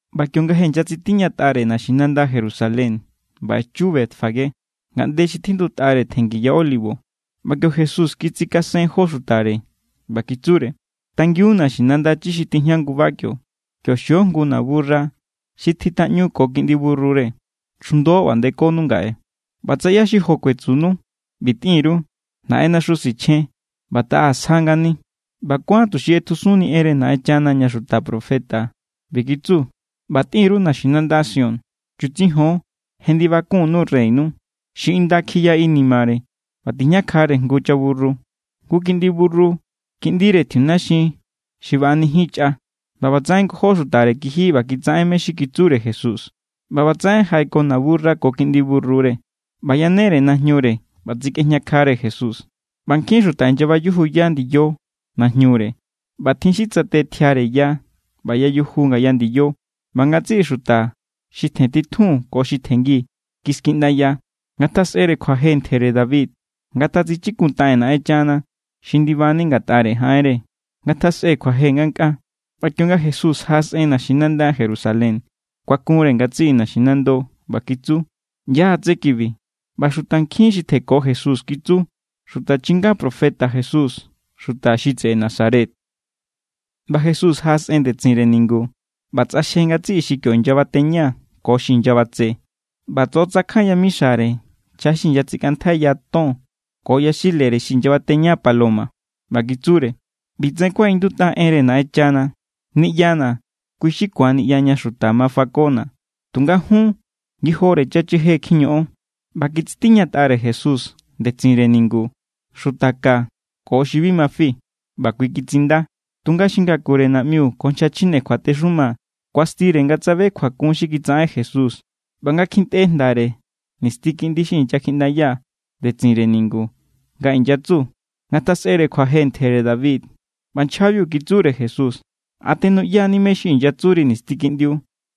ꞌBa kionga je inyatsitiñatꞌare naxinanda Jerusalén ꞌba echu Betfagé, ngaꞌnde xi tjindutꞌare tjenngi ya Olivo, ꞌba kio Jesús kitsikasen jó xutare, ꞌba kitsure: —Tangiun naxinanda chi xi tijña nguba kio. Kio xio jngu naburra xi kjitꞌaꞌñu ko kiꞌndi burrure. Chjundo ꞌba ndekonu ngaꞌe. ꞌBa tsa ꞌyá= xi jo kuetsunu, ꞌbi tꞌin_ru: “Naꞌennaxu sichjen, ꞌba taꞌa sja ngani.” ꞌBa kuán tuxi ꞌetjusunni enre Naꞌenchana ña xuta profeta ꞌbi kitsu: ꞌBa tꞌin_ru naxinanda Sión: “Chutsijon, je ndibakunnu Reynu, xi inda kjiya inimare ꞌba tijñakjare jngu chaburru, jngu kiꞌndi burru, kiꞌndire tjiunaxin xi baꞌanijin chꞌa.” ꞌBa ꞌbatsaꞌen ngojó xutare kiji ꞌba kitsaꞌen mé= xi kitsure Jesús. ꞌBa ꞌbatsaꞌen jaꞌeko naburra ko kiꞌndi burrure, ꞌba yanere najñure ꞌba tsikꞌejñakjare Jesús. ꞌBa nkjin xuta inyabayujuya ndiyo najñure, ꞌba tjin xi tsate tjiare ya ꞌba yayuju ngaya ndiyo. ꞌBa ngatsiꞌi xuta xi tjen titjun ko xi tjenngi, kiskiꞌndaya: —¡Ngatjasꞌere kjuaje ntjere David! ¡Ngatatsichikuntaꞌen Naꞌenchana xi ndibani ngatꞌare jaꞌenre! ¡Ngatjasꞌe kjuaje ngankꞌaa! ꞌBa kionga Jesús jaꞌasꞌen naxinanda Jerusalén, kuakunre ngatsiꞌi naxinando, ꞌba kitsu: —¿ꞌYá= tsé kibi? ꞌBa xutankjin xi tjenko Jesús kitsu: —Xuta chinga profeta Jesús, xuta xi tseꞌe Nazaret. ꞌBa Jesús jaꞌasꞌen ndetsinre ningu ꞌba tsꞌaxje ngatsiꞌi xi kio inyabateña ko xi inyabatse, ꞌba tsoꞌotsakjan yamixare nchja xi inyatsikꞌantjaiya ton ko yaxilere xi inyabateña paloma. ꞌBa kitsure: —ꞌBitsaꞌen kuaꞌindutꞌa enre Naꞌenchana: “Niꞌyana̱, kui= xi ku̱an niꞌya ña xuta ma fakona̱.” Tunga jun, ngijore chacheje kjiñoꞌon. ꞌBa kitsitiñatꞌare Jesús ndetsinre ningu xuta ka ko xi bi ma fi, ꞌba kui kitsinda. Tunga xi ngakure naꞌmiu ko nchja chjine kjuatexuma kuastire nga tsabe kjuakun xi kitsaꞌen Jesús ꞌba nga kjintꞌe jndare nisti kiꞌndi xi inyakjiꞌndaya ndetsinre ningu nga inyatsu: “¡Ngatjasꞌere kjuaje ntjere David!” ꞌBa nchjabiu kitsure Jesús: —¿A tenuꞌya=ni mé= xi inyatsuri nisti kiꞌndiu?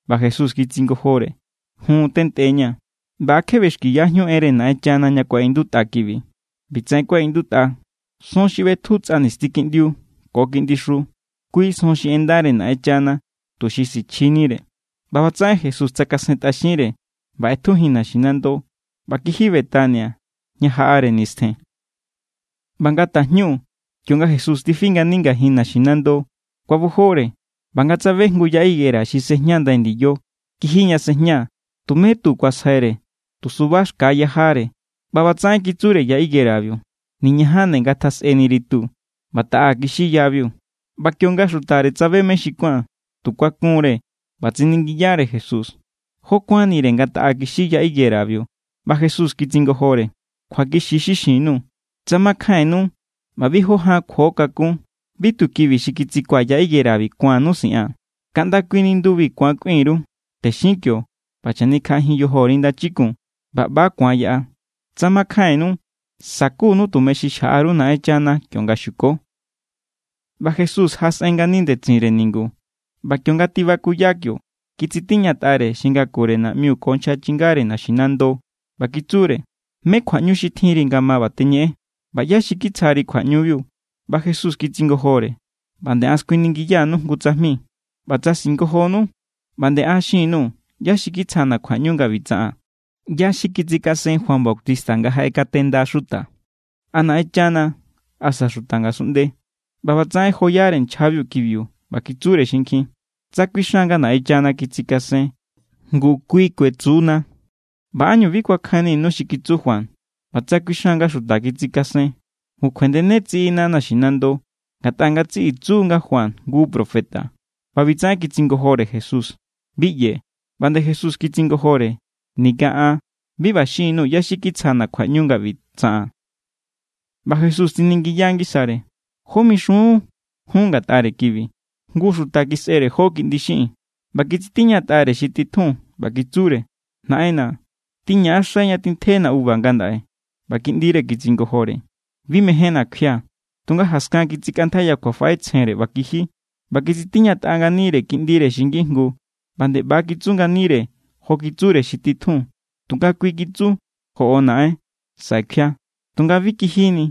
ꞌBa Jesús kitsingojore: —Jun, tentꞌeña̱. ꞌBa ¿a kje ꞌbexkiyajíun enre Naꞌenchana ña kuaꞌindutꞌa kibi? ꞌBi tsaꞌen kuaꞌindutꞌa: Son xi ꞌbetju tsꞌa nisti kiꞌndi ko kiꞌndixu, kui son xi ꞌendare Naꞌenchana tuxi sichjinire. ꞌBa ꞌbatsaꞌen Jesús tsakasentꞌaxinre ꞌba ꞌetjujin naxinando ꞌba kiji Betania ña jaꞌare nistjen. ꞌBa nga tajñu kionga Jesús tifi ngani ngajin naxinando, kuabojore. ꞌBa nga tsabe jngu ya higuera xi sejña ndai ndiyo, kiji ña sejña, tumé tu kuasjaiꞌare, tu suba xka= yajare. ꞌBa ꞌbatsaꞌen kitsure ya higuerabiu: —¡Niñajan nde ngatjasꞌeniri tu! ꞌBa taꞌa kixi yabiu. ꞌBa kionga xutare tsabe mé xi kuán, tu kuakunre, ꞌba tsiningiyare Jesús: —¿Jó kuánnire nga taꞌa kixi ya higuerabiu? ꞌBa Jesús kitsingojore: —Kjuakixi= xi xin_nuu̱. Tsa makjainnu ꞌba bi jó ján kjuo kakún, bi tu kibi xi kitsikuaa̱ ya higuera ku̱annu siꞌaa̱n, kaꞌnda kui nindubi ku̱an kꞌuin_ru: “Texin kio ꞌba chanikjaꞌajin yojori ndachikun”, ꞌba ꞌba= ku̱an yaꞌa. Tsa makjainnu, sakunu tumeñu xi xjaꞌa_ru Naꞌenchana kionga xuko. ꞌBa Jesús jaꞌasꞌen ngani ndetsinre ningu, ꞌba kionga tibakuya kio, kitsitiñatꞌare xi ngakure naꞌmiu ko nchja chingare naxinando, ꞌba kitsure: —¿Mé= kjuaꞌñu xi tjinri nga ma ꞌba teñeꞌen? ꞌBa ¿ꞌyá= xi kitsjari kjuaꞌñubiu? ꞌBa Jesús kitsingojore: —ꞌBa nde an skuiningiya_nuu̱ jngu tsajmi, ꞌba tsa singojonu, ꞌba nde an xin_nuu̱ ꞌyá xi kitsjana̱ kjuaꞌñu nga ꞌbi tsaꞌaa̱n. ¿ꞌYá= xi kitsikasen Juan Bautista nga jaꞌekatenda xuta? ¿A Naꞌenchana, asa xuta ngasunꞌnde? ꞌBa ꞌbatsaꞌen joyare nchjabiu kibiu, ꞌba kitsure xinkjin: —Tsa kuixan nga Naꞌenchana kitsikasen, ngu kui kuetsu=na: “¿ꞌBa ánñu bi kuakjainninu xi kitsu Juan?” ꞌBa tsa kuixan nga xuta kitsikasen, ngu kjuendene tsiꞌina naxinando, ngatꞌa ngatsiꞌi tsu= nga Juan jngu profeta. ꞌBa ꞌbitsaꞌen kitsingojore Jesús: —Bi ꞌyee̱. ꞌBa nde Jesús kitsingojore: —Ninga an bi ꞌba xin_nuu̱ ꞌyá= xi kitsjana̱ kjuaꞌñu nga ꞌbi tsaꞌaa̱n. ꞌBa Jesús tsiningiya ngisare: —¿Jó mixun jun ngatꞌare kibi? Jngu xuta kisꞌere jó kiꞌndi xiꞌin. ꞌBa kitsitiñatꞌare xi titjun, ꞌba kitsure: “Naꞌenna̱, tꞌiñaꞌaxai ña tjintjena uva ngandaꞌe.” ꞌBa kiꞌndire kitsingojore: “Bi mejénna̱ kjuia̱.” Tunga jaskan kitsikꞌantjaiya kjuafaꞌetsjenre ꞌba kiji. ꞌBa kitsitiñatꞌa nganire kiꞌndire xi ngijngu ꞌba nde ꞌba= kitsu nganire jo kitsure xi titjun. Tunga kui kitsu: “Joꞌo naꞌen, saꞌe kjuia̱.” Tunga bi kijini.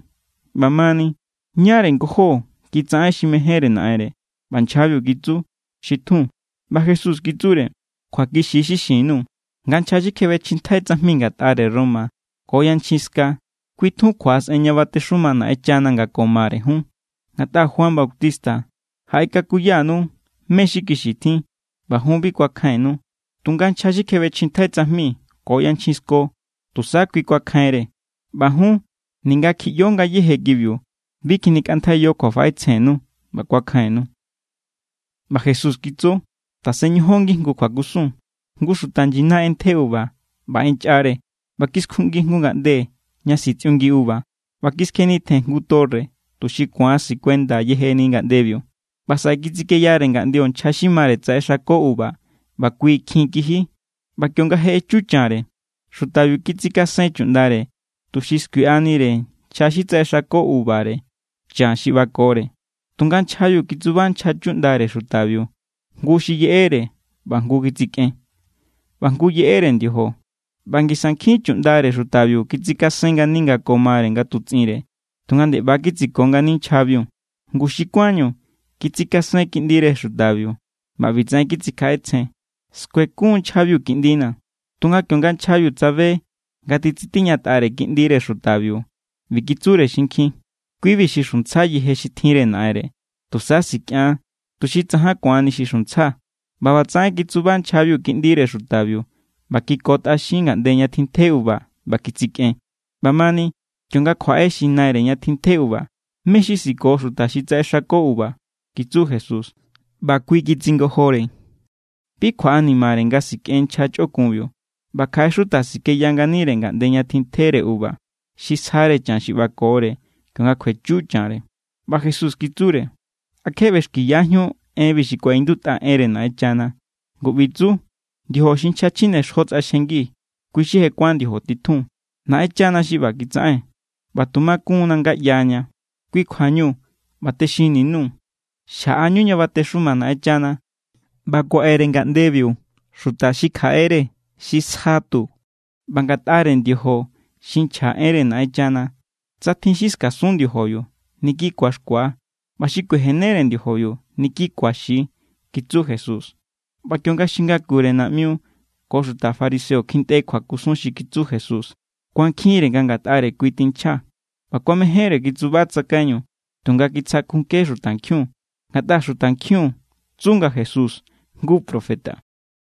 ꞌBamani, ¿ñáre ngojó kitsaꞌen xi mejénre naꞌenre? ꞌBa nchjabiu kitsu: —Xi tjun. ꞌBa Jesús kitsure: —Kjuakixi= xi xin_nuu̱ nga nchja xi kjebechjintjai tsajmi ngatꞌare Roma ko yanchjin ska, kui tjun kjuaꞌasꞌen ña batexuma Naꞌenchana nga ko mare jun. Ngatꞌa Juan Bautista jaꞌekakuyanu mé= xi kixi tjin, ꞌba jun bi kuakjainnu. Tunga nchja xi kjebechjintjai tsajmi ko yanchjin sko, tusa kui kuakjainre. ꞌBa jun, ninga kjiꞌyo ngayéje kibiu, bi kjinikꞌantjaiyo kjuafaꞌetsjennu ꞌba kuakjainnu. ꞌBa Jesús kitsu: —Tasen ñojon ngijngu kjuakusun: Jngu xuta nyina ꞌentje uva, ꞌba ꞌenchꞌare, ꞌba kiskjuꞌngi jngu ngaꞌnde ña sitsꞌiungi uva, ꞌba kiskjenitjen jngu torre, tuxi ku̱an sikuenda yejeni ngaꞌndebiu. ’ꞌBa saꞌe kitsikeyare ngaꞌndio nchja xi mare tsaꞌexako uva ꞌba kui kjin kiji. ꞌBa kionga je echu chanre, xutabiu kitsikasen chuꞌndare, tuxi skuiꞌanire nchja xi tsaꞌexako uvare chan xi ꞌbakore. Tunga nchjabiu kitsuba nchja chuꞌndare xutabiu. Jngu xi yeꞌere, ꞌba jngu kitsikꞌen, ꞌba jngu yeꞌere ndiojo. ꞌBa ngisa nkjin chuꞌndare xutabiu kitsikasen ngani nga ko mare nga tutsꞌinre, tunga nde ꞌba= kitsiko ngani nchjabiu. ’Ngu xi kuánñu kitsikasen kiꞌndire xutabiu, ꞌba ꞌbitsaꞌen kitsikjaꞌetsjen: “Skuekun nchjabiu kiꞌndina̱.” Tunga kionga nchjabiu tsabe nga titsitiñatꞌare kiꞌndire xutabiu, ꞌbi kitsure xinkjin: “Kui=bi xi xuntsja yeje xi tjinre naꞌenre. Tusa sikꞌian, tuxi tsajan ku̱anni xi xuntsja.” ꞌBa ꞌbatsaꞌen kitsuba nchjabiu kiꞌndire xutabiu ꞌba kikotꞌaxin ngaꞌnde ña tintje uva ꞌba kitsikꞌen. ’ꞌBa mani, kionga kjuaꞌe xi naire ña tjintje uva, ¿mé= xi siko xuta xi tsaꞌexako uva? —kitsu Jesús. ꞌBa kui kitsingojore: —Bi kjuaꞌanimare nga sikꞌen nchja chꞌokunbiu. ꞌBa kjaꞌe xuta sikeya nganire ngaꞌnde ña tintjere uva, xi sjare chan xi ꞌbakore kionga kjuechu chanre. ꞌBa Jesús kitsure: —¿A kje ꞌbexkiyajíun enbi xi kuaꞌindutꞌa enre Naꞌenchana? Ngu ꞌbi tsu: Ndiojo xi nchja chjinexjo tsꞌaxjengi, kui= xi je kuán ndiojo titjun. Naꞌenchana xi ꞌba kitsaꞌen, ꞌba tu makun=na nga ꞌyaña. Kui= kjuañu ꞌba texinni_nuu̱. Xjaꞌanu ña batexuma Naꞌenchana, ꞌba kuaꞌe=re ngaꞌndebiu xuta xi kjaꞌere xi sja tu. ꞌBa ngatꞌare ndiojo xi nchja enre Naꞌenchana, tsa tjin xi skasun ndiojobiu, niki ku̱axkua. ꞌBa xi kuejenere ndiojobiu, niki ku̱axi —kitsu Jesús. ꞌBa kionga xi ngakure naꞌmiu ko xuta fariseo kjintꞌe kjuakusun xi kitsu Jesús, kuankjinre nga ngatꞌare kui tinchja. ꞌBa kuamejénre kitsuba tsakaiñu, tunga kitsakjunke xutankjiun, ngatꞌa xutankjiun tsu nga Jesús jngu profeta.